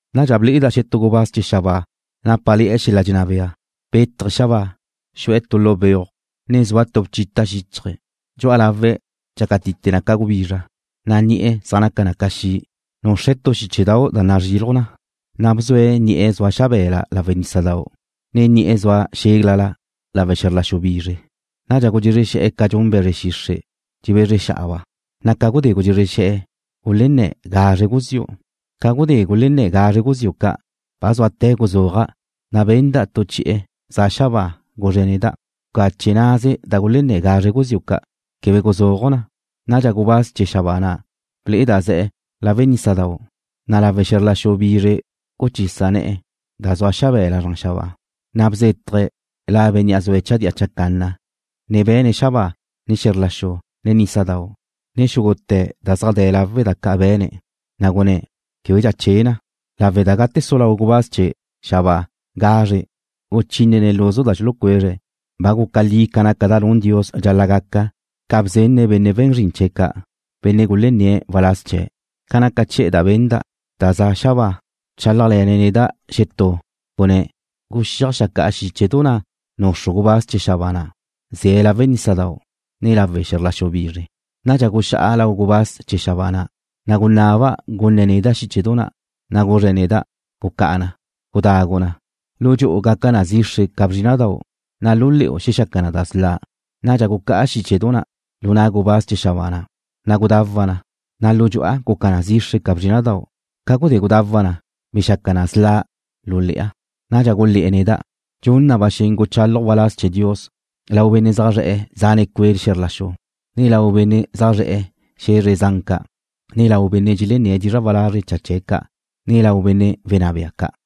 Nadxa ble'eda' xetú gubáz chee̱ xabáa nápale̱'e̱ xel-la' dxenná bea. Bétaje̱' xabáa, xu'e̱ tu lu beuj, ne zua tu bchita' xíchaje̱'. Dxu'a lawe̱' dxácatite na ca gubizra, na' ni'e̱ zaj naca na ca xi'. Nuxre̱' tu xíchedau' da nazriluj na, na' bzue̱' ni'e̱ zua xabe̱la lawe' nísadau', ne ni'e̱ zua xéglala lawe' xe̱zr la xu bizre. Nadxa gudxezre xe̱'e̱ ca dxun be̱zre xixre' dxebezre xa'aba', na' ca gudxezre xe̱'e̱ gulenné̱ gazre guziu'. Ca gudé gulenné̱ gazre guziu' ca', ba zúate̱ guzúaja', na' benda' tu chi'e̱ za xabáa, guzre neda': ―Bcache naze da gulenná gazre guziu' ca'. Quebe guzúaju' na. Nadxa gubáz chee̱ xabáa na' ble'eda' ze̱' lawe' nísadau', ne lawe' xe̱zr la xu bizre guchisa ne̱'e̱ da zua xabe̱la zran xabáa, na' bzétaje̱' La Bénnea' zue̱' chadía chacanna, ne be̱ne̱' xabáa, ne xe̱zr la xu, ne nísadau', ne xúgute̱ da zaj de̱ lawe' da ca' be̱ne̱', na' gunné̱': ―Québedxa che na, lawe' da gate su lau gubáz chee̱ xabáa gazre guchínene̱' luzu da xulucuezre̱', ba guca li ca naca da nun Dios dxal-la' gaca ca bzenne̱' benne' we̱n zrin chee̱' ca', benne' gulenné̱' waláz chee̱'. Ca naca chi'e̱ da benda', da za xabáa, bchálajle̱ne̱' neda' xetú, gunné̱': ―Guxíaj xeajcá'a xíchedu na' nuxru gubáz chee̱ xabáa na' ze̱' lawe' nísadau', ne lawe' xe̱zr la xu bizre. Nadxa guxá'a lau gubáz chee̱ xabáa na', na' gunaba' gunne̱' neda' xíchedu na', na' guzre̱' neda': ―Gucá'a na. Gudagu na. Lu dxu'u gaca na zixre ca bzrína'dau', na' lu le̱'u xexaca na da sla'. Nadxa gucá'a xíchedu na' lu na' gubáz chee̱ xabáa na', na' gudawa' na, na' lu dxu'a guca na zixre ca bzrína'dau'. Ca gudé gudawa' na, bexaca na sla' lu le̱'a. Nadxa gulé̱'e̱ neda': ―Dxun na ba xen guchálaju' waláz chee̱ Dios lau benne' zaj zre̱'e̱ zane cue' xe̱zr la xu, ne lau benne' zaj zre̱'e̱ xe̱zre zan ca', ne lau benne' dxelenné̱' dizra' walazre' cha chee̱' ca', ne lau benne' wenná bea ca'.